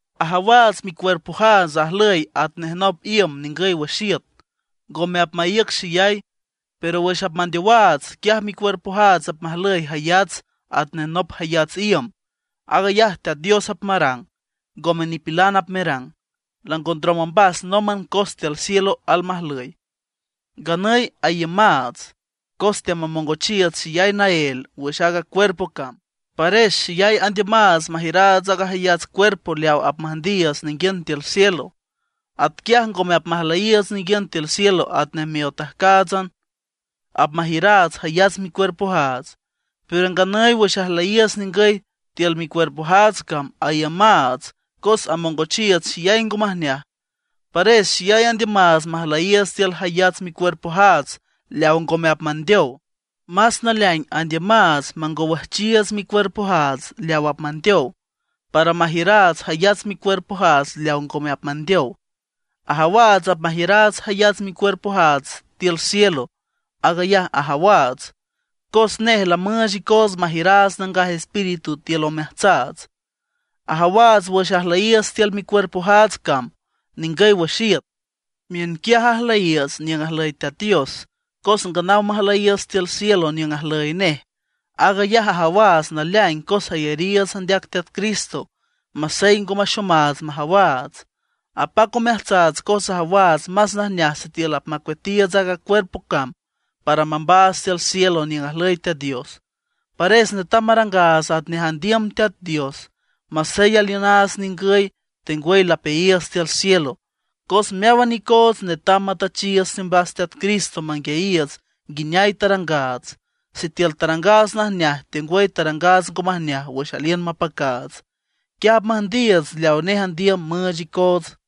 Ajawaats micuerpojaats ajlüy atnej nop iüm ningüy wüx iüt, ngome apmaíüc xeyay. Pero wüx apmandeowaats, quiaj micuerpojaats apmajlüy jayats atnej nop jayats iüm. Aag ayaj Teat Dios apmarang, ngome nipilan apmerang, lango ndrom ombas nómban cos tiül cielo almajlüy. Nganüy aiümaats, cos teamamongochiiüts xeyay naél wüx aaga cuerpo cam. Pares xeyay andiümaats majiüraats aaga jayats cuerpo leaw apmüjndiiüts ninguiün tiül cielo. Atquiaj ngome apmajlüyiiüts ninguiün tiül cielo atnej miotajcáatsan, apmajiüraats jayats micuerpojaats. Pero nganüy wüx ajlüyiiüts ningüy tiül micuerpojaats cam aiümaats cos amongochiiüts xeyay ngo majneaj. Pares xeyay andiümaats majlüyiiüts tiül jayats micuerpojaats leaw ngome apmandeow; más naleaing andiümaats mangowüjchiiüts micuerpojaats leaw apmandeow, para majiüraats jayats micuerpojaats leaw ngome apmandeow. Ajawaats apmajiüraats jayats micuerpojaats tiül cielo. Aag ayaj ajawaats, cos nej lamüüch icoots majiüraats Nangaj Espíritu tiül omeajtsaats. Ajawaats wüx ajlüyiiüts tiül micuerpojaats cam ningüy wüx iüt, miünquiaj ajlüyiiüts niüng ajlüy Teat Dios, cos nganaw majlüyiiüts tiül cielo niüng ajlüy nej. Aag ayaj ajawaats naleaing cos ayariiüts andeac Teat Cristo, masey ngome axomaats majawaats. Apac omeajtsaats cos ajawaats más najneaj sitiül apmacueatiiüts aaga cuerpo cam para mambaats tiül cielo niüng ajlüy Teat Dios. Pares netam marangaats atnej andiüm Teat Dios, masey aliünaats ningüy, tengwüy lapeayiiüts tiül cielo. Cos meáwan icoots netam matüchiiüts teombas Teat Cristo manguiayiiüts nguineay tarangaats, sitiül tarangaats najneaj tengwüy tarangaats ngo majneaj wüx aliün mapacaats. Quiaj apmüjndiiüts leaw nej andiüm müüch icoots.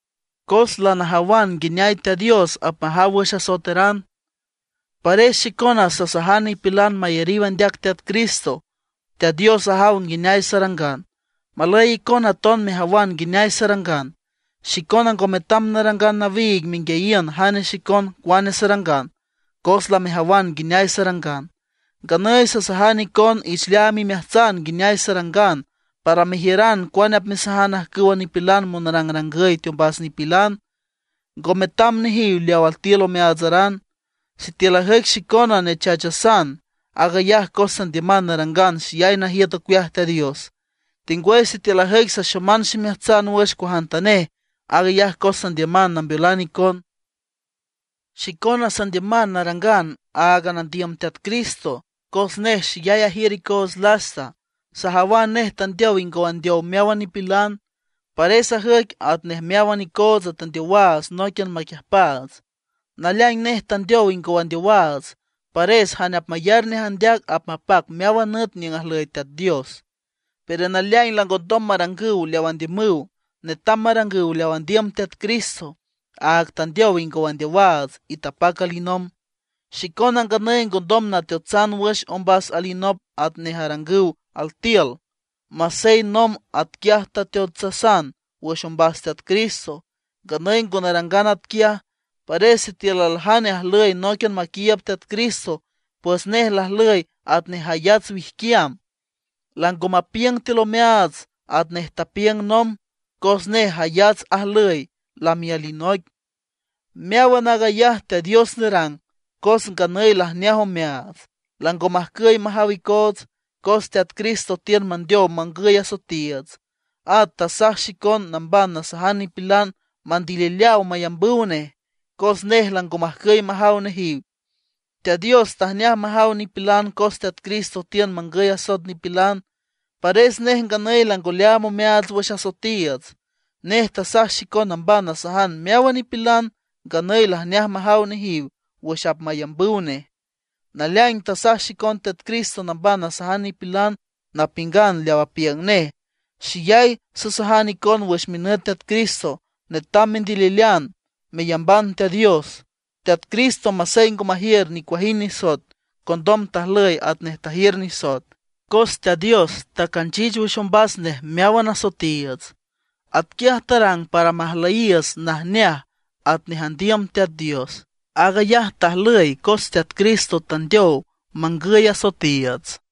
Cos lanajawan nguineay Teat Dios apmajaw wüx asoeteran, pares xicona sasajan nipilan mayariw andeac Teat Cristo. Teat Dios ajaw nguineay sarangan. Malüy icona aton mejawan nguineay sarangan. Xicona ngo metam narangan nawiig menguiayiün jane xicon cuane sarangan, cos lamejawan nguineay sarangan. Nganüy sasajan icon ich leaam imeajtsan nguineay sarangan, para mejiüran cuane apmesajan ajcüwa nipilan monrangrangüy teombas nipilan, ngo metam nejiw leaw altiül omeaatsaran. Sitiül ajüic xicona nechachasan, aag ayaj cos sandiüman narangan xeyay najiüt ocueaj Teat Dios. Tengwüy sitiül ajüic saxoman ximeajtsan wüx cuajantanej, aag ayaj cos sandiüman nambeolan icon. Xicona sandiüman narangan áagan andiüm Teat Cristo, cos nej xeyay ajiür icoots lasta. Sajawan nej tandeow ingow andeow meáwan nipilan; pares ajüic atnej meáwan icoots tandeowaats nóiquian maquiüjpaats. Naleaing nej tandeow ingow andeowaats, pares jane apmayar nej andeac apmapac meáwan nüt niüng ajlüy Teat Dios; pero naleaing langondom marangüw leaw andiümüw. Netam marangüw leaw andiüm Teat Cristo, áag tandeow ingow andeowaats, y tapac alinomb. Xicona nganüy ngondom nateotsan wüx ombas alinop atnej arangüw altiül, masey nomb atquiaj tateotsasan wüx ombas Teat Cristo, nganüy ngo narangan atquiaj. Pares sitiül aljane ajlüy nóiquian maquiiüb Teat Cristo, pues nej lajlüy atnej jayats wijquiam; lango mapiüng tiül omeaats atnej tapiüng nomb, cos nej jayats ajlüy, lami alinoic. Meáwan aag ayaj Teat Dios nerang, cos nganüy lajneaj omeaats, lango majcüy majaw icoots, cos Teat Cristo tiün mandeow mangüy asoetiiüts. At tasaj xicon namban nasajan nipilan mandilileaw mayambüw nej, cos nej lango majcüy majaw nejiw. Teat Dios tajneaj majaw nipilan cos Teat Cristo tiün mangüy asoet nipilan, pares nej nganüy lango leaam omeaats wüx asoetiiüts. Nej tasaj xicon namban nasajan meáwan nipilan nganüy lajneaj majaw nejiw wüx apmayambüw nej. Naleaing tasaj xicon Teat Cristo namban nasajan nipilan, napiüngan leaw apiüng nej. Xeyay sasajan icon wüx minüt Teat Cristo, netam mendililean meyamban Teat Dios. Teat Cristo masey ngo majiür nicuajind nisoet, condom tajlüy atnej tajiür nisoet, cos Teat Dios tacanchich wüx ombas nej meáwan asoetiiüts. Atquiaj tarang para majlüyiiüts najneaj atnej andiüm Teat Dios. Aag ayaj tajlüy cos Teat Cristo tandeow mangüy asoetiiüts.